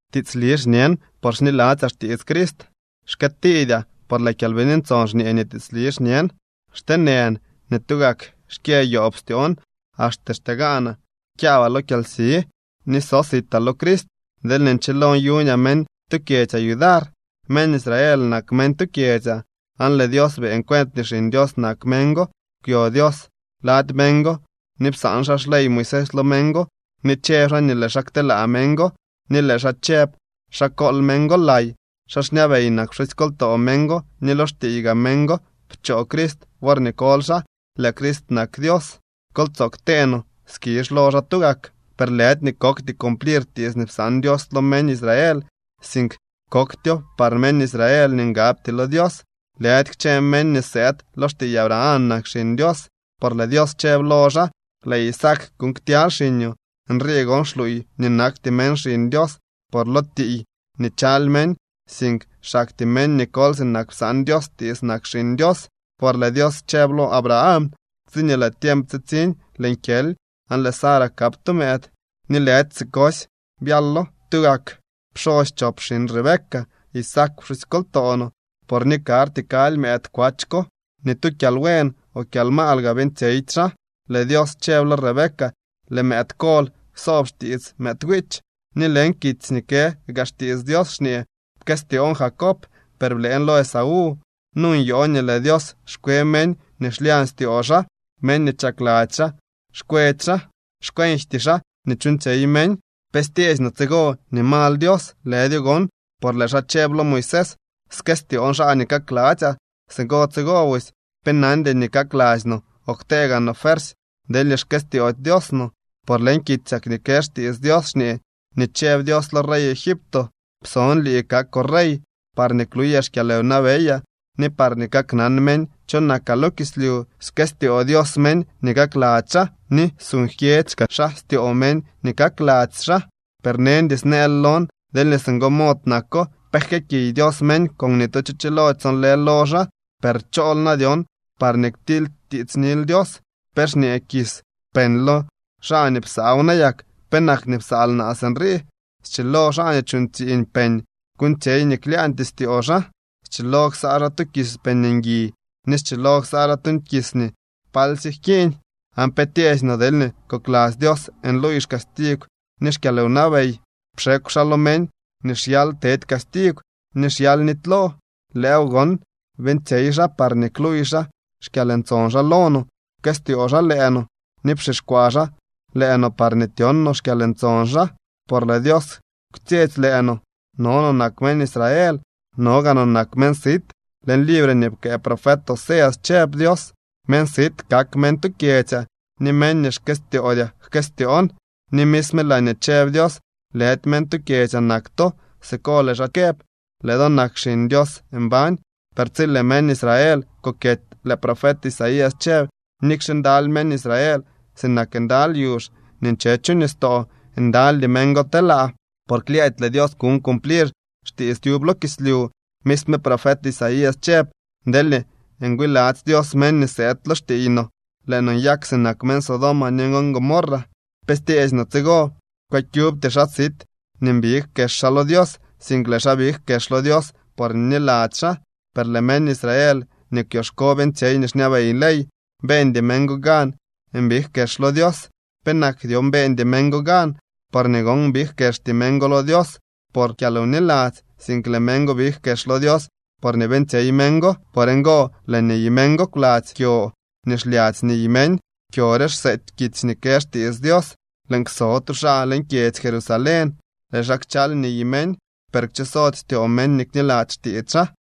Tiitsli xñen, por xniladzyaa xtiits Crist. Xkëëtiidyaa, por lëë Kyalbini Ntson xñee nii tiitsli xñen. Xteenën ni tugak xkyë yoob styoon. Axte xtegaanaa kyaabaa lo kyalsi, ni so sitaa lo Crist, deelñee nchilo nyuñaa meñ tu kyedzyaa yudar. Meñ Israel nak meñ tu kyedzyaa, aan lëë Dios beeñ cuent nii xiñ Dios nak meñ go. Kwyo Dios lady meñ go ni psaan xaa xley Moisés lo meñ go, ni chëb xaa nii lëë xaa kteelaa meñ go, ni lëë xaa chëb xa kool meñ go lay. Xaa xñabey nak pxusykoltoo meñ go ni lo xtiiy gaa meñ go pchoo Crist worñee koly xaa. Lëë Crist nak Dios. Kol tsoo ktee no skizh lo xaa tugak. Per lëdy nii kokty cumplir tiits nii psaan Dios lo meñ Israel, sink koktyo par meñ Israel nii ngabty lo Dios. Lëdy kchë meñ nii sëëd lo xtiiy Abraham nak xiñ Dios, por lëë Dios chëb lo xaa: “Lëë Isaac kuuñ ktyaly xiñoo.” Nrii gon xluuy nii nakty meñ xiñ Dios por lo tiiy nii chaly meñ, sink xaktyee meñ nii koly sinak psaan Dios tiits nak xiñ Dios. Por lëë Dios chëb lo Abraham: “Tsiñee lëë tiemp tsitsiñ, lëën kyely, aan lëë Sara kap tu mëëd.” Ni lëdy sikosy byalo. Tugak pxosy chop xiñ Rebeca, Isaac pxusykoltoo no. Por ni karty kaly mëëd kwach ko, ni tu kyalbuen o kyalmaal gaa beeñtsyeydy xaa, lëë Dios chëb lo Rebeca: “Lëë mëëd kol ksoob xtiits mëëd wiich.” Ni leñ kitsy nii kë gaa xtiits Dios xñee: “Pkëstyoon Jacob, per blëën lo Esaú.” Nu nyoo nii lëë Dios xkwe meñ nii xlyañ styoo xaa, meñ nii chakladzy xaa xkwetsy xaa. Xkwenjty xaa nii chuuñtsyey meñ. ¿Pe styeesy no tsigo nii mal Dios? ¡Lëdyo gon! Por lëë xaa chëb lo Moisés: “Skëstyoon xaa nii kakladzyaa.” Singo tsigo busy, pe nandy nii kakladzy no o ktee gaa no fuersy, deelñee xkëstyoody Dios no. Por leñ kitsyak nii kë xtiits Dios xñee nii chëb Dios lo rey Egipto: “Pson lii kakoo rey parñee kluyaa xkyalwnabeyaa, ni parñee kaknan meñ cho nakaa lo kislyu.” Skëstyoo Dios meñ nii kakladzy xaa, ni suuñ jkyedzy kaa xaa styoo meñ nii kakladzy xaa. Per neñdy snëël lon: “Deelñee singo mod nako, ¿pe jkëëkiy Dios meñ con ni tu cho chilody sonlë lo xaa?” Per ¿chool na dyon parñee ktilytiitsnil Dios? ¿Pe xñee kis peñ lo xaa nii psaaw nayak: “¿Penak nii psaal naa sinrii?” Schilo xaa nii chuuñ tsiiñ peñ kuuñtsyey nii klyaañtyee styoo xaa. Schilo ksaa xaa tu kis peñ ngui, ni schilo ksaa xaa tu kis nii palsye jkiiñ. ¿Aan pe tyeesy no deelñee kokladzy Dios nluuy xcastigw ni xkyalwnabey, pxekw xaa lo meñ nii xyal tedy castigw ni xyal nitylo? Lëëw gon beeñtsyey xaa parñee kluuy xaa xkyalntson xaa lo no. Pkëstyoo xaa lëë no ni pxixkwaa xaa lëë no parñee tyon no xkyalntson xaa. Por lëë Dios kwtsyetsy lëë no. No no nak meñ Israel. No gaa no nak meñ sit. Leñ libre nii pkëë profet Oseas chëb Dios: Meñ sit kak meñ tu kyedzyaa, ni meñ nii xkëstyoodyaa jkëstyoon. Ni misme laañee chëb Dios: “Lëdy meñ tu kyedzyaa nak to”, siko lëë xaa këb: Lëë do nak xiñ Dios mbañ. Per tsi lëë meñ Israel kokyety, lëë profet Isaías chëb: “Nikxe ndaly meñ Israel sinak ndaly yuzh nii nche chu nistoo, ndalydy meñ go telaa. Por klyëëdy lëë Dios kuñ cumplir xtiits tyub lo kislyu.” Misme profet Isaías chëb: Deelñee ngwiladzy Dios meñ nii sëëd lo xtiiy no, lëë no nyak sinak meñ Sodoma ni Gomorra. ¿Pe styeesy no tsigo? Kwëkyubty xaa sit nii mbig kex xaa lo Dios, sink lëë xaa big kex lo Dios porñee bniladzy xaa. Per lëë meñ Israel nii kwyoxko beeñtsyey nii xñabey ley, beeñdy meñ go gan mbig kex lo Dios. ¿Penak dyon beeñdy meñ go gan? Porñee gon big kexty meñ go lo Dios por kyalwniladzy, sink lëë meñ go big kex lo Dios por nii beeñtsyey meñ go. Por ngo lëë niy meñ go kwladzy kyo nii xlyadzy niy meñ. Kyo re xseety kitsy nii kë xtiits Dios: Lëën kso tu xaa leñ kyedzy Jerusalén. Lëë xaa kchal niy meñ, per kchosody styoo meñ nii kniladzy xtiits xaa.